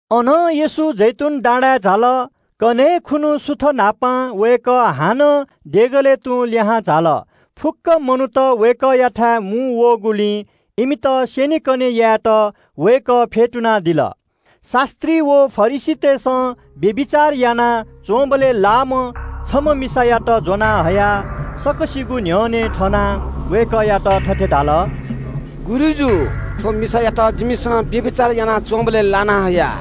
अनं येशू जैतून डाँडाय् झाल। कन्‍हय् खुन्‍हु सुथ न्‍हापां वय्‌कः हानं देगलय् तुं लिहां झाल। फुक्‍क मनूत वय्‌कःयाथाय् मुंवःगुलिं इमित स्‍यनेकने यायेत वय्‌कः फ्‍यतुनादिल। शास्‍त्री व फरिसीतय्‌सं व्‍यभिचार यानाच्‍वंबलय् ज्‍वंम्‍ह छम्‍ह मिसायात हयाः सकसिगुं न्‍ह्यःने थनाः वय्‌कःयात थथे धाल – “गुरुजु, थ्‍व मिसायात जिमिसं व्‍यभिचार यानाच्‍वंबलय् ज्‍वना हया।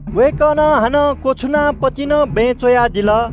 वय्‌कलं हानं क्‍वछुनाः पतिंचां बँय् च्‍वयादिल।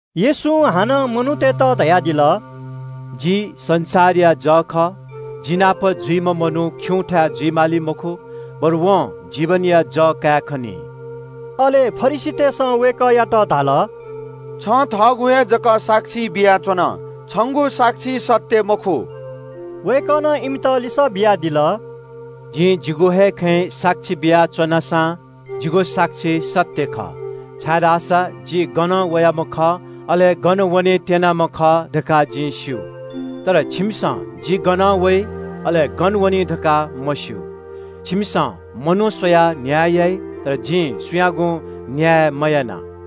येशूं हानं मनूतय्‌त धयादिल – “जि संसारया जः खः। जि नाप जुइम्‍ह मनू खिउँथाय् जुइ माली मखु, बरु वयात जीवनया जः दइ।” अले फरिसीतय्‌सं वय्‌कःयात धाल – “छं थःगु हे जक साक्षी बियाच्‍वन, छंगु साक्षी सत्‍य मखु।” वय्‌कलं इमित लिसः बियादिल – “जिं जिगु हे खँय् साक्षी बियाच्‍वना सां जिगु साक्षी सत्‍य खः, छाय्‌धाःसा जि गनं वयाम्‍ह खः, अले गन वने त्‍यनाम्‍ह खः धकाः जिं स्‍यू, अय्‌नं छिकपिन्‍सं धाःसा जि गनं वइ, अले गन वनी धकाः सी मखु। छिकपिन्‍सं मनू स्‍वयाः न्‍याय यानादी, तर जिं सुयागुं न्‍याय मयाना।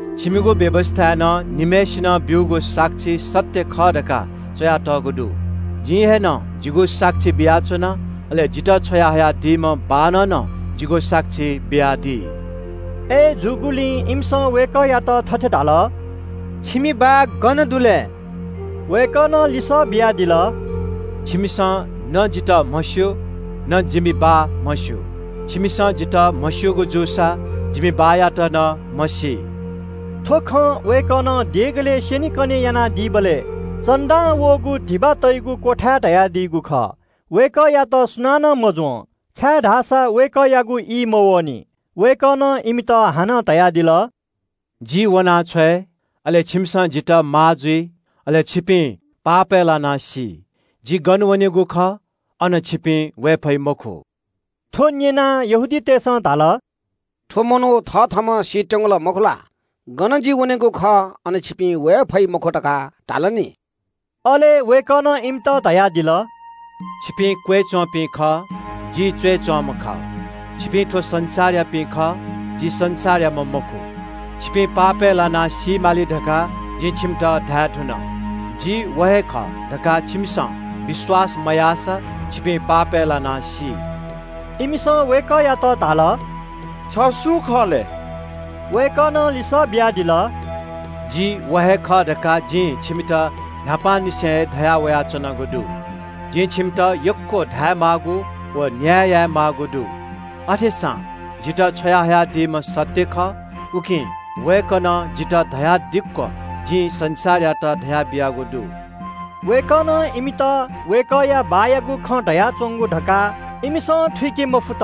छिकपिनिगु व्‍यवस्‍थाय् नं निम्‍हय्‌सिनं ब्‍यूगु साक्षी सत्‍य खः धकाः च्‍वयातःगु दु। जिं थःम्‍हं हे जिगु साक्षी बियाच्‍वना, अले जितः छ्वयाहयादीम्‍ह बाःनं नं जिगु साक्षी बियादी।” अय्‌जूगुलिं इमिसं वय्‌कःयात थथे धाल – “छिमि बाः गन दु लय्?” वय्‌कलं लिसः बियादिल – “छिकपिन्‍सं न जितः म्‍हस्‍यू, न जिमि बाःयात म्‍हस्‍यू। छिकपिन्‍सं जितः म्‍हस्‍यूगु जूसा जिमि बाःयात नं म्‍हसी।” थ्‍व खँ वय्‌कलं देगलय् स्‍यनेकने यानादीबलय् भेटी तइगु बाकसया न्‍ह्यःने धयादीगु खः। वय्‌कःयात सुनानं मज्‍वं, छाय्‌धाःसा वय्‌कःयागु ई मवःनि। वय्‌कलं इमित हानं धयादिल – “जि वनाछ्वये, अले छिकपिन्‍सं जितः माः जुइ, अय्‌नं छिकपिं पापय् लानाः सी। जि गन वनेगु खः, अन छिकपिं झाये फइ मखु।” थ्‍व न्‍यनाः यहूदी नायःतय्‌सं धाल – “थ्‍व मनू थथःम्‍हं सीत्‍यंगु ला मखु? ‘गन जि वनेगु खः अन छिपिं वये फइ मखु’ धकाः धाल नि।” अले वय्‌कलं इमित धयादिल – “छिकपिं क्‍वय्‌च्‍वंपिं खः, जि च्‍वय्‌च्‍वंम्‍ह खः। छिकपिं थ्‍व संसारयापिं खः, जि संसारयाम्‍ह मखु। छिकपिं पापय् लानाः सी माली धकाः जिं छिकपिन्‍त धायेधुन। जि व हे खः धकाः छिकपिन्‍सं विश्‍वास मयाःसा छिकपिं पापय् लानाः सी।” इमिसं वय्‌कःयात धाल – “छ सु खः लय्?” वय्‌कलं लिसः बियादिल – “जि व हे खः धकाः जिं छिकपिन्‍त न्‍हापांनिसें हे धयावयाच्‍वनागु दु। जिं छिकपिन्‍त यक्‍व धायेमाःगु व न्‍याय यायेमाःगु दु। अथेसां जितः छ्वयाहयादीम्‍ह सत्‍य खः, उकिं वय्‌कलं जितः धयादिक्‍व जिं संसारयात धयाबियागु दु।” वय्‌कलं इमित बाःयागु खँ धयाच्‍वंगु धकाः इमिसं थुइके मफुत।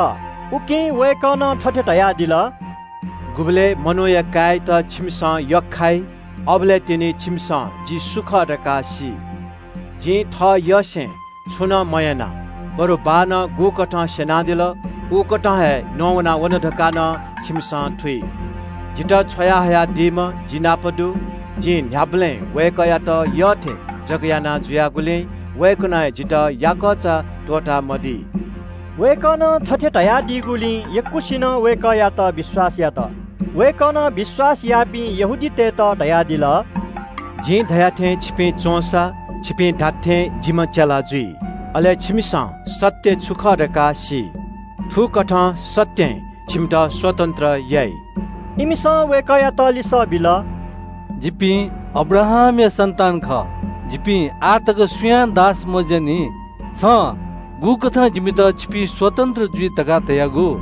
उकिं वय्‌कलं थथे धयादिल – “गुबलय् छिमिसं मनूया काय्‌यात यख्‍खाइ, अबलय् तिनि छिमिसं जि सु खः धकाः सी। जिं थःयसें छुं नं मयाना, बरु बाःनं गुकथं स्‍यनादिल उकथं हे नवाना वन धकाः नं छिमिसं थुइ। जितः छ्वयाहयादीम्‍ह जि नाप दी, जिं न्‍ह्याबलें वय्‌कःयात यःथें जक यानाजुयागुलिं वय्‌कलं जितः याकःचा त्‍वःतामदी।” वय्‌कलं थथे धयादीगुलिं यक्‍वसिनं वय्‌कःयात विश्‍वास यात। येशूं थःत विश्‍वास याःपिं यहूदीतय्‌त धयादिल – “जिं धया थें छिपिं च्‍वंसा छिपिं धात्‍थें जिम्‍ह चेला जुइ। छिमिसं सत्‍य छु खः धकाः सी, अले सत्‍यं छिमित स्‍वतन्‍त्र याइ।” इमिसं वय्‌कःयात लिसः बिल – “जिपिं अब्राहामया सन्‍तान खः, जिपिं आः तक सुयां दास मजुयानि। छं गुकथं जिमित ‘छिपिं स्‍वतन्‍त्र जुइ’ धकाः धयागु?”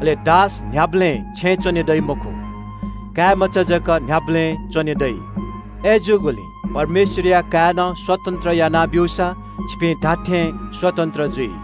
अले दास न्‍ह्याबलें छेँय् च्‍वने दइ मखु, काय्‌मचा जक न्‍ह्याबलें च्‍वने दइ। अय्‌जूगुलिं परमेश्‍वरया काय्‌नं स्‍वतन्‍त्र याना ब्‍यूसा छिकपिं धात्‍थें स्‍वतन्‍त्र जुइ।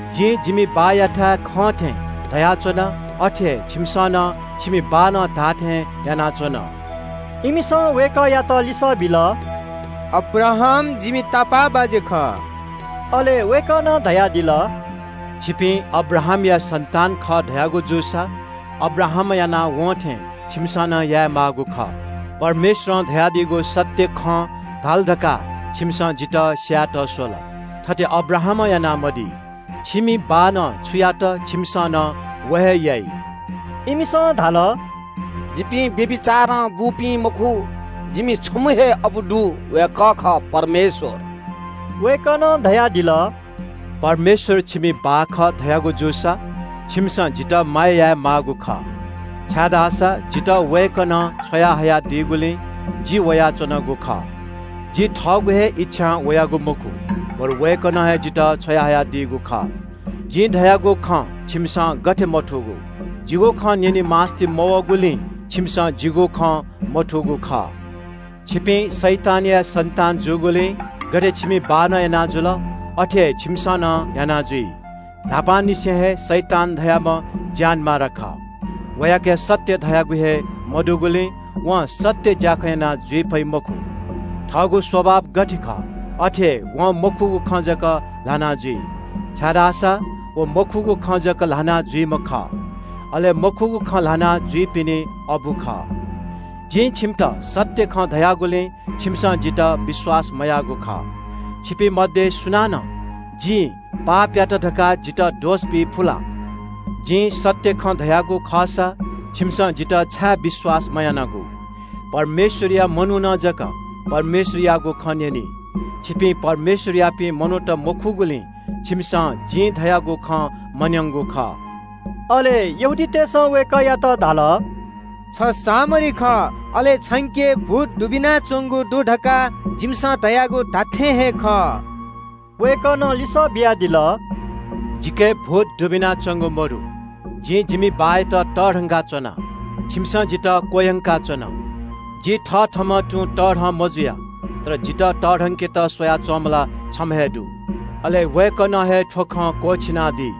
जिं जिमि बाःयाथाय् खं थें धयाच्‍वना, अथे हे छिकपिन्‍सं नं छिमि बाःनं धाःथें यानाच्‍वन।” इमिसं वय्‌कःयात लिसः बिल – “अब्राहाम जिमि तापाःबाज्‍या खः।” अले वय्‌कलं धयादिल – “छिकपिं अब्राहामया सन्‍तान खः धयागु जूसा अब्राहामं यानाः वं थें छिकपिन्‍सं नं यानादी माःगु खः। परमेश्‍वरं धयादीगु सत्‍य खँ धाल धकाः छिकपिन्‍सं जितः स्‍यायेत स्‍वल, थथे अब्राहामं यानामदी। छिकपिनि बाःनं छु यात छिकपिन्‍सं नं व हे यानादी।” इमिसं धाल – “जिपिं व्‍यभिचारं बूपिं मखु, जिमि छम्‍ह हे अबु दु, वय्‌कः खः परमेश्‍वर।” वय्‌कलं धयादिल – “परमेश्‍वर छिकपिनि बाः खः धयागु जूसा छिकपिन्‍सं जितः माया यानादी माःगु खः, छाय्‌धाःसा जितः वय्‌कलं छ्वया हयादीगुलिं जि वयाच्‍वनागु खः। जि थःगु हे इच्‍छां वयागु मखु, बरु वय्‌कलं हे जितः छ्वयाहयादीगु खः। जिं धयागु खँ छिकपिन्‍सं गथे मथूगु? जिगु खँ न्‍यने मास्‍ति मवःगुलिं छिकपिन्‍सं जिगु खँ मथूगु खः। छिकपिं शैतानया सन्‍तान जूगुलिं गथे छिकपिनि बाःनं याना जुल, अथे हे छिकपिन्‍सं नं याना जुइ। न्‍हापांनिसें हे शैतान धाःम्‍ह ज्‍यानमारा खः। वयाके सत्‍य धयागु हे मदुगुलिं वं सत्‍य ज्‍याखँ याना जुइ फइ मखु। थःगु स्‍वभाव गथे खः अथे हे वं मखुगु खँ जक ल्‍हाना जुइ, छाय्‌धाःसा व मखुगु खँ जक ल्‍हाना जुइम्‍ह खः, अले मखुगु खँ ल्‍हाना जुइपिनि अबु खः। जिं छिकपिन्‍त सत्‍य खँ धयागुलिं छिकपिन्‍सं जितः विश्‍वास यानामदीगु खः। छिकपिं मध्‍ये सुनानं जिं पापयात काः जितः दोष बियादी फु ला? जिं सत्‍य खँ धयागु खःसा छिकपिन्‍सं जितः छाय् विश्‍वास याना मदीयागु? परमेश्‍वरया मनुखं जक परमेश्‍वरयागु खँ न्‍यनी। छिकपिं परमेश्‍वरयापिं मनूत मखुगुलिं छिकपिन्‍सं जिं धयागु खँ न्‍यनामदीगु खः।” अले यहूदी नायःतय्‌सं वय्‌कःयात धाल – “छ सामरी खः, अले छंके भूत दुबिनाच्‍वंगु दु धकाः जिमिसं धयागु धात्‍थें हे खः।” वय्‌कलं लिसः बियादिल – “जिके भूत दुबिनाच्‍वंगु मदु। जिं जिमि बाःयात तःधंका च्‍वना, छिकपिन्‍सं जितः क्‍वह्यंकादिल। जि थथःम्‍हं तुं तःधं मजुया, तर जितः तःधंकेत स्‍वया च्‍वंम्‍ह ला छम्‍ह हे दु। अले वय्‌कलं हे थ्‍व खँ क्‍वःछिनादी।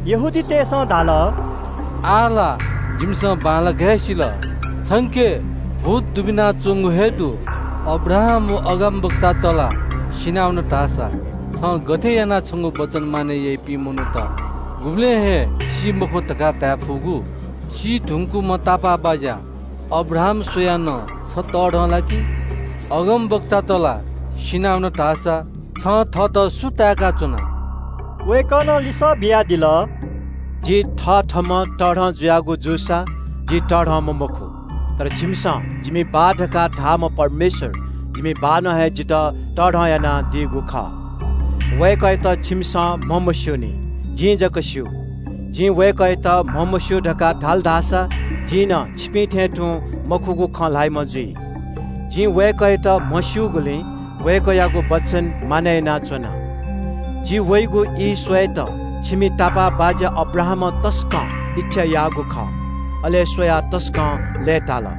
इमिसं धाल – “आः ला जिमिसं बांलाक हे सिल, छंके भूत दुबिनाच्‍वंगु हे दु। अब्राहाम व अगमवक्तात ला सिनावन धाःसा छं गथे यानाः छंगु वचन मानय् याइपिं मनूत गुबलें हे सी मखु धकाः धाये फुगु? सी धुंकूम्‍ह तापाःबाज्‍या अब्राहाम स्‍वयाः नं छ तःधं ला कि छु? अगमवक्तात ला सिनावन धाःसा छं थःत सु ताय्‌का च्‍वना?” वय्‌कलं लिसः बियादिल – “जि थथःम्‍हं तःधं जुयागु जूसा जि तःधंम्‍ह मखु। तर छिकपिन्‍सं जिमि बाः धकाः धाःम्‍ह परमेश्‍वर जिमि बाःनं हे जितः तःधं यानादीगु खः। वय्‌कःयात छिकपिन्‍सं म्‍हमस्‍यूनि, जिं धाःसा म्‍हस्‍यू। जिं वय्‌कःयात म्‍हमस्‍यू धकाः धाल धाःसा जि नं छिकपिं थें तुं मखुगु खँ ल्‍हाइम्‍ह जुइ। जिं वय्‌कःयात म्‍हस्‍यूगुलिं वय्‌कःयागु वचन मानय् यानाच्‍वना। जि वइगु ई स्‍वयेत छिकपिनि तापाःबाज्‍या अब्राहामं तसकं इच्‍छा याःगु खः, अले खनाः तसकं लय्‌ताल।”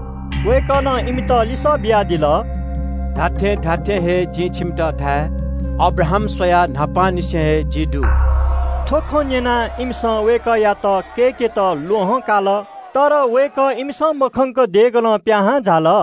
वय्‌कलं इमित लिसः बियादिल – “जिं छिकपिन्‍त खःगु खँ धाये – अब्राहाम स्‍वयाः न्‍हापांनिसें हे जि दु।” थ्‍व खँ न्‍यनाः इमिसं वय्‌कःयात कय्‌केत ल्‍वहं काल। तर वय्‌कः इमिसं मखंक सुरुक्‍क देगलं पिहां झाल।